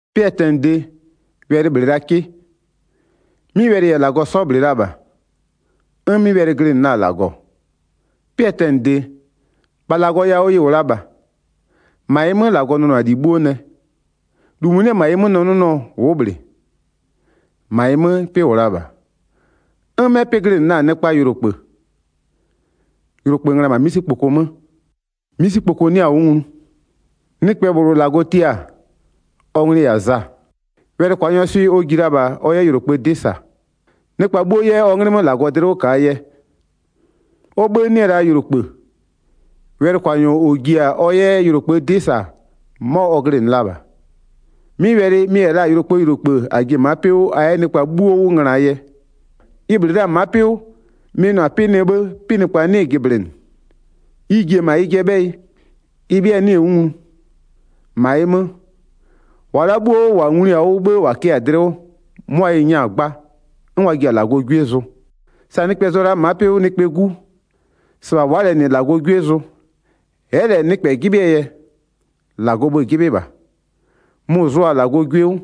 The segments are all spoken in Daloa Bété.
'Pɩɛ tɛnɩde, Wɛlɩ -bhlɩ la 'kɩ, 'mɩ Wɛlɩ -yɛ -Lagɔ 'sɔ -bhlɩ la -bha, 'n 'mɩ Wɛlɩ glɩnɩ la-a -Lagɔ. 'Pɩɛ tɛnɩde, -bha -Lagɔ yawʋ ɩ -wʋ la -bha. 3-Ma ɩ 'mö -Lagɔ nʋnʋ-a -li 'bhuo nɛ, -lu -mʋ 'nɩ -ma ɩ 'mö nɛ 'nʋnʋɔ ʋ'ʋ -bhlɩ. 4-Ma ɩ 'mö 'pɩ -wʋ la -bha, 'n 'mɛ 'pɩ glɩnɩ la-a nɩkpaa yʋlokpë. Yʋlokpë ngöna-a -ma 'misikpoko 'mö, 'misikpoko 'nɩa-a 'wʋ nglu. Nɩkpɛ -bhlʋ -Lagɔ tia-a, ɔ nglɩ-ɩ -yɛ-a Za. Wɛlɩkwanyɔɔ swɩ ɔ ji la -bha ɔ 'yɛ yʋlokpëë 'dɩ -sa, nɩkpa 'bhuo 'yɛ ɔ 'nglɩ 'mö -Lagɔ dlɩ 'wʋ -kaa yɛ. Ɔ 'bhë 'nɩ-ɛ la yʋlokpë, wɛlɩkwanyɔ -ɔ ji-a ɔ 'yɛ yʋlokpëë 'dɩ -sa, 'mɔ ɔ glɩnɩ la -bha. 'Mɩ Wɛlɩ, ɩ 'nyize -yɛ la-a yʋlokpëë -yʋlokpë -a ji-e ma'a 'pɩ 'wʋ a 'yɛ nɩkpa 'bhuo 'wʋ ngönaa yɛ. Ɩ -bhlɩ la ma'a 'pɩ 'wʋ, mɩ-ɩ nʋ-a 'pɩ nɛ 'bhë 'pɩnɩkpa 'nɩɩ-ɩ jɩblɩnɩ. Ɩ ji-e -ma ɩjɩɛ 'bhɛyɩ, ɩ 'bhɩa 'nɩɩ-ɩ 'wʋ nglu. 12-Ma ɩ 'mö, -wa la'a 'bhuo -wa nglui-a 'wʋ 'bhë -wa kɩ-a dlɩ 'wʋ, 'mʋa ɩ 'nyɛ-a 'gba 'n wa ji-a -Lagɔɔ 'gwie zʋ. Sa nɩkpɛ zʋ-ɔ la'a ma'a 'pɩ 'wʋ nɩkpɛɛ 'gu, -sɩbha wa'a -lɛ -nɩ -Lagɔɔ 'gwie zʋ. Ɛ'ɛ -lɛ 'yɛ nɩkpɛ 'jɩbhɩɛ yɛ, -Lagɔɔ bhë-ë 'jɩbhɩ -bha, mʋ-ʋ zʋʋa-a -Lagɔɔ 'gwie 'wʋ.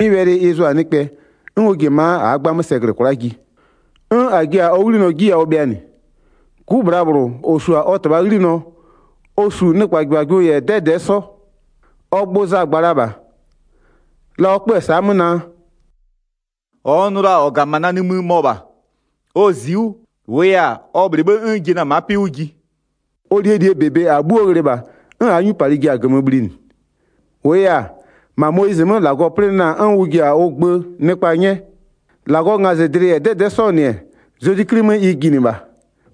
'Mɩ Wɛlɩ ɩ zʋ-a nɩkpɛ, 'n ɔ ji-e ma'a -aa 'gbamö sɛ -glɩ kwla'a ji, 'n -a ji-a ɔ 'ghlinɔ 'ji yawʋ bhɩanɩ, 'Gu -bhlabhlʋ -ɔ -su-a ɔ -Tɩbhaa 'ghlinɔ, ɔ -su nɩkpajɩbhajɩbhʋ -yɛ 'dɛdɛ'ɛ 'sɔ. Ɔ gbʋ Za gba la -bha, la ɔ 'kpö-ö sa'a 'mö naa: “-Ɔ n nʋ la-a -ɔ -ga -ma na nimï, mɔ -bha. Ɔ zi'i 'wʋ, -wʋʋ yɛ-a, ɔ -bhlɩ 'bhë 'n n ji-e na-a ma'a 'pɩ 'wʋ ji.” Ɔ -lie -li -bebe -aa 'bhuo ghlɩ -bha, 'n -aa 'nyupalɩ ji-a -gömö bhlinɩ. 17-Wʋʋ yɛ-a, -ma Moyizɩ 'mö -Lagɔ plɩnɩ la-a 'n ʋ -jiya-a ʋ gbö 'nyɛ, -Lagɔɔ ngazɩdlɩ -yɛ 'dɛdɛ'ɛ 'sɔɔ -nɩ-ɛ, Zezwi 'Kli 'mö ɩ jinɩ -bha.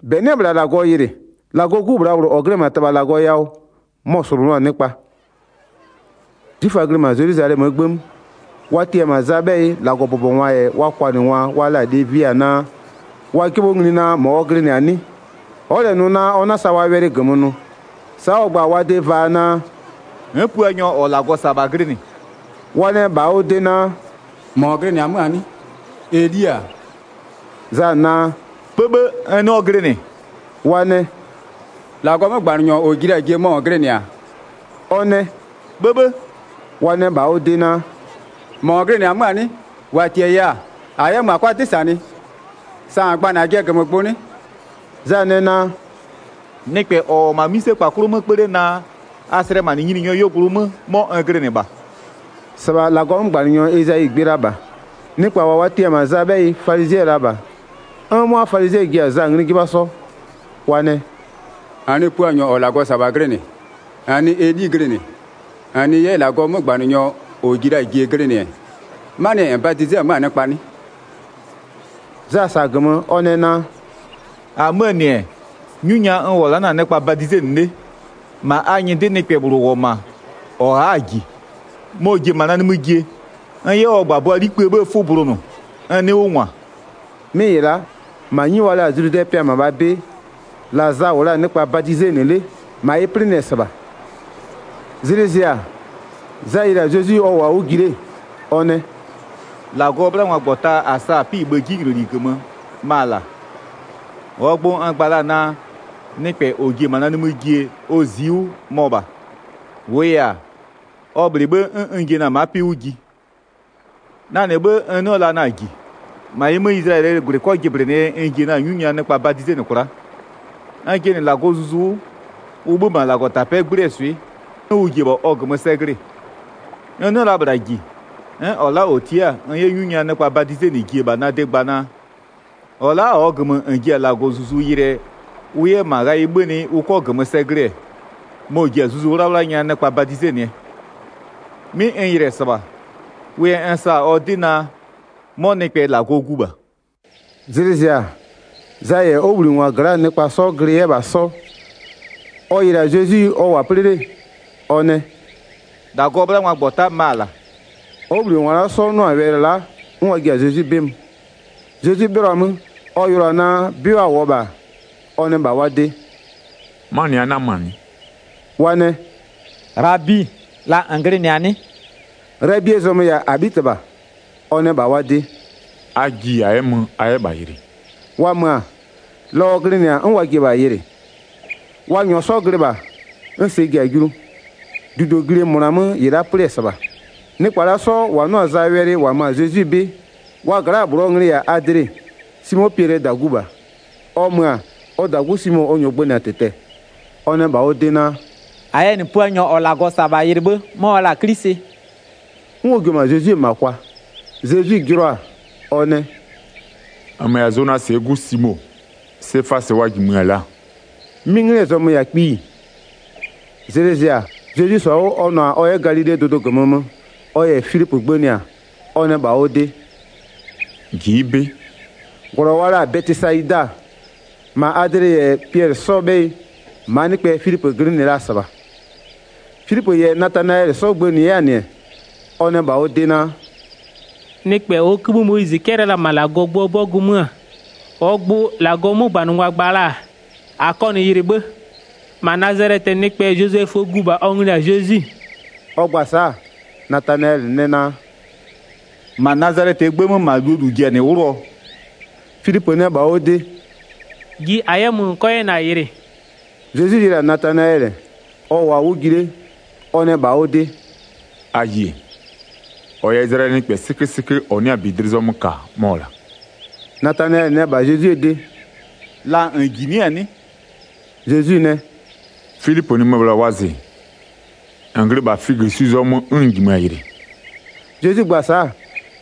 18-Bɛ 'nɩ-ɛ -bhla -Lagɔ yɩlɩ, -Lagɔɔ 'Gu -bhlabhlʋ -ɔ glɩ-ɛ -ma -Tɩbha -Lagɔ yawʋ, mɔ-ɔ -slʋnʋʋ-a nɩkpa. 'Zwiföa glɩ -ma Zelwizalɛmöö 'gbë 'mö, wa tia-a -ma Zaa 'bhɛyɩ -Lagɔbʋbɔngwa -yɛ wa kwanɩngwa wa la-a Levia naa, wa 'jɩbhɔ ngli naa -mɔ ɔ glɩnɩ-a 'nɩ? Ɔ'ɔ -lɛ nʋ ɔ 'na-a sa wa wɛlɩ -gömö nʋ, sa'a ɔ gba-a wa de vaa naa: “N'n Puanyɔ -ɔ -Lagɔ -sa-a -bha glɩnɩ.” Wa nɛ -bha ɔ de naa: “-Mɔ -n glɩnɩ-ɛ 'mö-a 'nɩ? Eli-a?” Za naa: “'Bhëbhë, n 'nɩɔ glɩnɩ.” Wa nɛ: “-Lagɔɔ 'mögbanɩnyɔ -ɔ ji la-a jie mɔ -n glɩnɩ-a?” Ɔ nɛ: “'Bhëbhë!” Wa nɛ -bha ɔ de naa: “-Mɔ -n glɩnɩ-ɛ 'mö-a 'nɩ? -Wa -tiaya-a -a 'yɛ mö -a 'kʋa 'dɩ -sanɩ, sa -n gba-a -najɩɛ -gömögbʋ 'nɩ?” Za nɛ naa: “Nɩkpɛ -ɔ -wʋ-ɔ -ma 'mïsekpa 'klʋ 'mö 'kpö 'le naa: A slɛmanɩ Nyininyɔɔ 'yuogblʋ 'mö, 'mɔ n glɩnɩ -bha.” -Sɩbha -Lagɔɔ 'mögbanɩnyɔ Ezayi gbɩ la -bha. Nɩkpa -wa wa tia-a -ma Zaa 'bhɛyɩ falizɩɛ la -bha. 'N 'mʋa falizɩɛ ji-a Za ngli 'jɩbha 'sɔ, wa nɛ: “-N nɩ Puanyɔ -ɔ -Lagɔ -sa-a -bha glɩnɩ, -n nɩ Eli glɩnɩ, -n nɩ 'yɛ -Lagɔɔ 'mögbanɩnyɔ -ɔ ji la-a jie glɩnɩ-ɛ, 'manɩɛ yɛ -n badize 'mö-a nɩkpa 'nɩ?” Za -sa-a -gömö, ɔ nɛ naa: “-Amöö -nɩ-ɛ, 'nyu nya n -wʋ-ɔ la'a na-a nɩkpa badizenɩ 'le, -ma a nyɩdɩ nɩkpɛ -bhlʋ -wʋ-ɔ -ma -ɔ a'a-a -ji, mɔ-ɔ ji-e -ma na nimï jie, n 'yɛ ɔ -gbabʋaa 'likpë 'bhëë 'fʋ bulonʋ, n 'nɩɩ 'wʋ -ngwa.” 'Mɩ -ɩ la'a, -ma 'nyi wa la-a Zludɛɛ pɩa -mabhaa 'bɩ, la Za -wʋ la-a nɩkpa badizenɩ 'le, -ma ɩ 'plɩnɩ-ɛ -sɩbha. Zlɩ zɩ-a, Za yɩlɩ-a Zezwi, ɔ -wʋɔ-a 'wʋ ji 'le, ɔ nɛ: “-Lagɔɔ 'bhlangwagbɔta -a sa-a 'pɩ-ɩ bhë 'jinyloli -gömö, ma-a -la. 30-Ɔɔ gbʋ n gba la-a naa: Nɩkpɛ -ɔ ji-e -ma na nimï jie, ɔ zi'i 'wʋ, mɔ -bha. -Wʋʋ yɛ-a, ɔ -bhlɩ 'bhë 'n n ji-e na-a ma'a 'pɩ 'wʋ ji. Na -nɩ 'bhë n 'nɩɔ la na-a -ji. -Ma ɩ 'mö, Izlayɛlɩɛ -gwlɩ 'kɔ jɩblɩnɩɛ yɛ n ji-a 'nyu nya nɩkpa badizenɩ kwla'a. N jɩnɩ -Lagɔɔ Zuzu 'wʋ, ʋ 'bhö-ö -ma -Lagɔtapɛ'ɛ 'gblɩɛ swɩ'ɩ, 'n ʋ ji-e -bha ɔ -gömö sɛ glɩ-ɩ. N 'nɩɔ la -bhla -ji, 'n -ɔ la'a -ɔ tia'a n 'yɛ 'nyu nya nɩkpa badizenɩ ji-e -bha na de gba naa: -Ɔ la'a -ɔɔ -gömö -n ji-a -Lagɔɔ Zuzu yɩlɩɛ ʋ 'yɛ -ma ghayɩ 'bhönɩ ʋ 'kɔ -gömö sɛ glɩ-ɛ, mɔ-ɔ ji-a Zuzu 'Wlawla nya nɩkpa badizenɩɛ. 'Mɩ n yɩlɩ-ɛ -sɩbha, wʋ yɛ n sa-a ɔ 'dɩ naa, 'mɔ nɩkpɛ -Lagɔɔ Gu -bha.” Zlɩ zɩ-a, Za -yɛ ɔ 'wʋbhlinɩngwa gla'aa nɩkpa 'sɔ glɩ 'yɛ -bha 'sɔ. Ɔ yɩlɩ-a Zezwi ɔ -wʋ-a 'plɩ 'le, ɔ nɛ: “-Lagɔɔ 'bhlangwagbɔta ma-a -la.” Ɔ 'wʋbhlinɩngwa la'a 'sɔ 'nʋ-a wɛlɩ la'a, 'n wa ji-a Zezwi 'bɩ mö. Zezwi 'bhɩlɔ-a 'mö ɔ yɩlʋa-a naa 'bɩ wa -wʋɔ -bha-a, ɔ nɛ -bha wa de: “'Manɩ a 'nama-a 'nɩ?” Wa nɛ: “Ghlabi, la -n glɩnɩ-a 'nɩ?” Ghlabie zɔmö-ö -yɛ-a -Abhitɩbha. Ɔ nɛ -bha wa de: “A ji -a 'yɛ mö, a 'yɛ -bha yɩlɩ.” Wa mö-a, la ɔ glɩnɩ-a 'n wa ji-e -bha yɩlɩ. Wa -nyɔɔ 'sɔ glɩ -bha, 'n sɛ ji-a julu. -Dudoglie -mʋna 'mö -ɩ la'a 'plɩ-ɛ -sɩbha. Nɩkpa la'a 'sɔ -wa 'nʋ-a Zaa wɛlɩ -wa mö-a Zezwi 'bɩ, wa gla'aa -bhlʋɔ nglɩ-ɩ -yɛ la-a Adle, Simo Piɛlɩɛ -dagu -bha. Ɔ mö-a, ɔ -dagu Simo ɔ -nyɔɔ 'sɔ gbënɩ-a -tɩtɛ-ɛ, ɔ nɛ -bha ɔ de naa: “-A yɛ -nɩ Puanyɔ -ɔ -Lagɔ -sa-a -bha yɩlɩ 'bhë 'mɔ wa la-a 'Klisɩ.” 'N ɔ jio-o -ma Zezwie -ma kwa. Zezwi jɩlɔ-a, ɔ nɛ: “-Nmö -yɛ-a Zonasɩɛ 'gu Simo, Sefasɩ wa -jimö-ö 'mö-a laa.” 'Mɩ 'nglɩɛ zɔmö-ö -yɛ-a kpiyi. Zlɩ zɩ-a, Zezwi -sɔ-a 'wʋ ɔ nʋ-a ɔ 'yɛ -ma Galilee dʋdʋ -gömö mö ɔ -yɛ Filipö gbënɩ-a, ɔ nɛ -bha ɔ de: “Ji'i 'bɩ.” 44-Glɔ wa la-a Bɛtɩsayida, -ma Adle -yɛ Piɛlɩ 'sɔɔ 'bhɛyɩ, -maa nɩkpɛ Filipö glɩnɩ la-a -sɩbha. Filipö -yɛ Natanayɛlɩ 'sɔ gbënɩ 'yɛ-a -nɩ, ɔ nɛ -bha ɔ de naa: “Nɩkpɛ -ɔɔ 'kïbhï Moyizɩ 'cɛlɩ la-a -ma -Lagɔɔ gböö 'bɔgʋ 'mö, -ɔɔ gbʋ -Lagɔɔ 'mögbanɩngwa gba la-a, -a kɔ -nɩ yɩlɩ 'bhë, -ma Nazalɛtɩɛ nɩkpɛ Zozɛföö gu -bha, ɔ nglɩ-ɩ -yɛ-a Zezwi.” Ɔ gba-a sa'a, Natanayɛlɩ nɛ naa: “-Ma Nazalɛtɩɛ 'gbë 'mö -ma -luo -lu ji-a -nɩ 'wlʋɔ?” Filipö nɛ -bha ɔ de: “Ji -a 'yɛ mö -n 'kɔ 'yɛ -na yɩlɩ.” Zezwi yɩlɩ-a Natanayɛlɩ, ɔ -wʋɔ-a 'wʋ ji 'le-e, ɔ nɛ -bha ɔ de: “A yie! -Ɔ -yɛ-a Izlayɛlɩɛ nɩkpɛ 'sɩkösɩkö -ɔ 'nɩ-a -bi dlɩ zɔmö -ka, mɔ-ɔ -la.” Natanayɛlɩ nɛ -bha Zezwie de: “La -n -jinɩ'ɩ-a 'nɩ?” Zezwi nɛ: “Filipö -nɩmö-ö -bhla wɔzɩ, -n glɩ -bha figösu zɔmö 'n n -jimö-a yɩlɩ.” Zezwi gba-a sa'a,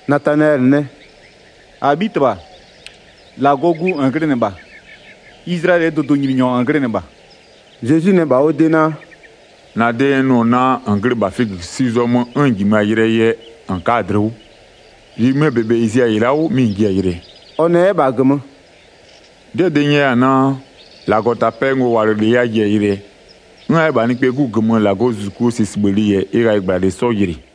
Natanayɛlɩ nɛ: “-Abhitɩbha, -Lagɔɔ Gu -n glɩnɩ -bha, Izlayɛlɩɛ dʋdʋnyininyɔ -n glɩnɩ -bha.” Zezwi nɛ -bha ɔ de naa: “-Na de n nʋ-ɔ naa -n glɩ -bha figösu zɔmö 'n n -jimö-a yɩlɩɛ yɛ -n ka'a-a -la dlɩ 'wʋ. -Li -mɩmɩɛ -bebe -ɩ zi-a -ɩ la'a 'wʋ, mɩ -n ji-a yɩlɩɛ.” Ɔ nɛ 'yɛ -bha -gömö: “'Dɩɛ -dɩ n nyɛya-a naa: -Lagɔtapɛɛ ngowalɩlɩ a ji-a yɩlɩɛ, 'n a 'yɛ-a -bha Nɩkpɛɛ 'Gu -gömö -Lagɔzuzukuo sɛsibhëlɩ -yɛ ɩ ghayɩgblalɩ 'sɔ yɩlɩ.”